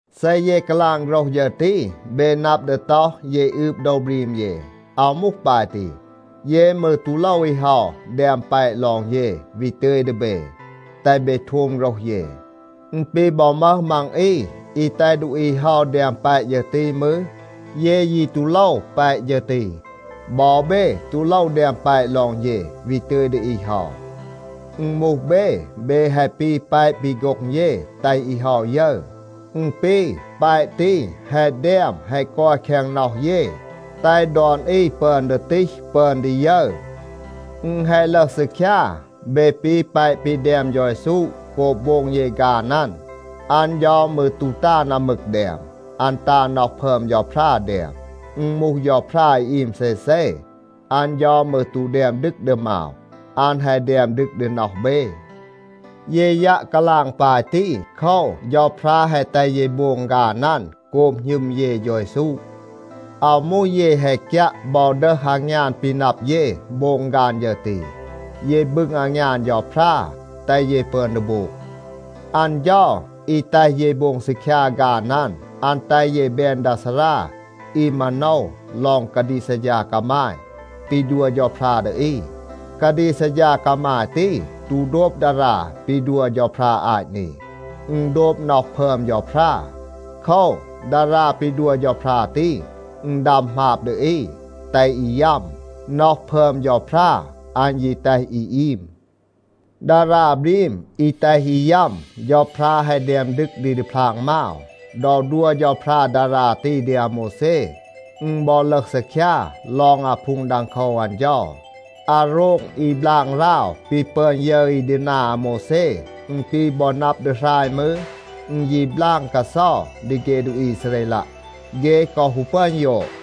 เซ เย กาลาง โฆรห ฌึร ตี, เบ นับ ดี ต็อห, เย อืบ โดว บรีม เย. อาว มูห ปาย ตี. เย มืร ตู โลว อี เฮา แดม แปะ ลอง เย, วี ตึย ดี เบ, แตห เบ โทม โฆรห เย. อึณ ปี บอ มึห มัง อี อี แตห ดูอี เฮา แดม แปะ ฌึร ตี มืร, เย ยี ตู โลว แปะ ฌึร ตี. บอ เบ ตู โลว แดม แปะ ลอง เย, วี ตึย ดี อี เฮา. อึณ มูห เบ, เบ แฮะ ปี แปะ ปี โฆ็ง เย แตห อี เฮา ยึร. อึณ ปี แปะ ตี แฮะ แดม แฮะ กอย แคง น็อห เย, แตห ดอน อี ปึอน ดี ตีห, ปึอน ดี ยึร. อึณ แฮะ ลึห ซีคยา, เบ ปี แปะ ปี แดม เฌา เยซู โกบ โบง เย ฆาน อัน. อัน เฌา มืร ตู ตา อึม มึก แดม. อัน ตา น็อห พึอม เฌาพรา แดม. อึณ มูห เฌาพรา อี อีม เซเซ, อัน เฌา มืร ตู แดม ดึก ดี มาว, อัน แฮะ แดม ดึก ดี น็อห เบ. เย ยัะ กาลาง ปาย ตี. โคว, เฌาพรา แฮะ แตห เย โบง ฆาน อัน โกบ หณึม เย เฌา เยซู. อาว มูห เย แฮะ กยัะ บอ ดึห อางยาน ปี นับ เย, โบง ฆาน ฌึร ตี. เย บึง อางยาน เฌาพรา, แตห เย ปึอน ดี โบง. อัน เฌา อี แตห เย โบง ซีคยา ฆาน อัน, อัน แตห เย แบน ดา ซารา อี มาโนว ลอง กาดีก ซัดฌา กามาย ปี ดัว เฌาพรา ดี อี. กาดีก ซัดฌา กามาย ตี ตู โดบ ดารา ปี ดัว เฌาพรา อาต นี. อึณ โดบ น็อห พึอม เฌาพรา. โคว, ดารา ปี ดัว เฌาพรา ตี, อึณ ดัม หมาบ ดี อี, แตห อี ยัม. น็อห พึอม เฌาพรา, อัน ยี แตห อี อีม. ดารา บรีม อี แตห อี ยัม, เฌาพรา แฮะ แดม ดึก ดี ดีพลาง มาว. ดอ ดัว เฌาพรา ดารา ตี ดี อาโมวแซ, อึณ บอ ลึห ซีคยา ลอง อาพูง ดังโคว อัน เฌา. อาโรง อี บลาง ราว ปี ปึอน ยึร อี ดี นา อาโมวแซ, อึณ ปี บอ นับ ดี หราย มืร, อึณ ยี บลาง กาเซา ดี เฆ ดูอี อีซาเรลัะ. เฆ กอ ฮู ปึอน ยอด.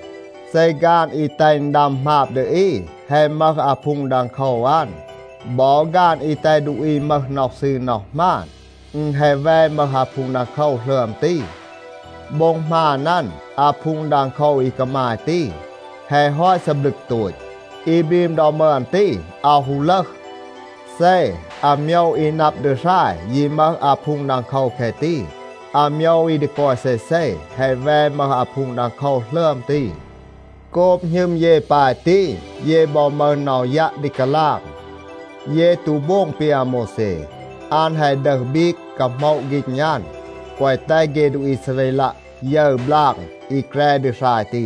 เซ ฆาน อี แตห อึณ ดัม หมาบ ดี อี แฮะ มึห อาพูง ดังโคว อัน, บอ ฆาน อี แตห ดูอี มึห น็อห ซืร น็อห หมาน, อึณ แฮะ แว มึห อาพูง ดังโคว หลึอม ตี. โบ็ง หมาน อัน, อาพูง ดังโคว อี กามาย ตี, แฮะ ฮอต ซีบลึก โตต. อี บรีม ดอ มึอน ตี, อาว ฮู ลึห. เซ อาโมยว อี นับ ดี หราย ยี มึห อาพูง ดังโคว แคะ ตี, อาโมยว อี ดี กอย เซเซ แฮะ แว มึห อาพูง ดังโคว หลึอม ตี. โกบ หณึม เย ปาย ตี, เย บอ มึห น็อห ยัะ ดี กาลาง. เย ตู โบง ปี อาโมวแซ. อัน แฮะ ดึห บีก, กาโหมะ ฆีณ อัน, แกวะ แตห เฆ ดูอี อีซาเรลัะ ยึร บลาง อี แกร ดี หราย ตี.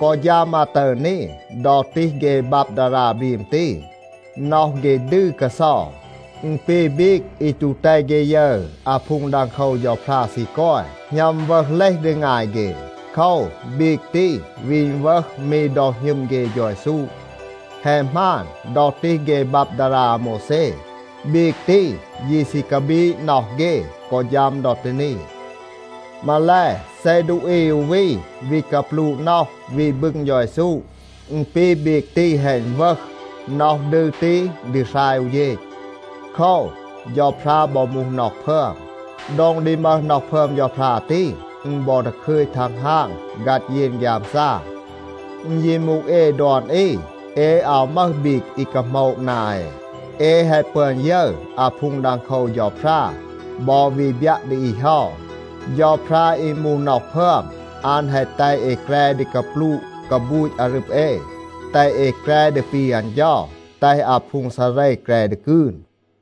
กอ ฌัม อาตึร นี, ดอ ตีห เฆ บับ ดารา บรีม ตี, น็อห เฆ ดืร กาเซา. อึณ ปี บีก อี ตู แตห เฆ ยึร อาพูง ดังโคว เฌาพรา ซี กอย, หณัม อึณวึห เลห ดี งาย เฆ. โคว, บีก ตี วี อึณวึห มี ดอ หณึม เฆ เฌา เยซู. แฮะ หมาน, ดอ ตีห เฆ บับ ดารา อาโมวแซ, บีก ตี ยี ซี กาบีด น็อห เฆ, กอ ฌัม ดอ ตี นี. มาแล, เซ ดูอี อู วี วี กาปลูะ น็อห, วี บึง เฌา เยซู, อึณ ปี บีก ตี แฮะ อึณวึห. น็อห ดืร ตี ดี หราย อู เฌณ. โคว, เฌาพรา บอ มูห น็อห พึอม. โดง ดี มึห น็อห พึอม เฌาพรา ตี, อึณ บอ ดาคึย ทังฮาง ฆัด เยน ฆยามซา. อึณ ยี มูห เอ ดอน อี, เอ อาว มึห บีก อี กาโหมะ นา เอ. เอ แฮะ ปึอน ยึร อาพูง ดังโคว เฌาพรา บอ วี บยัะ ดี อี เฮา. เฌาพรา อี มูห น็อห พึอม, อัน แฮะ แตห เอ แกร ดี กาปลูะ กาบูต อารึบ เอ, แตห เอ แกร ดี ปี อัน เฌา, แตห อาพูง ซาเร แกร ดี กืน.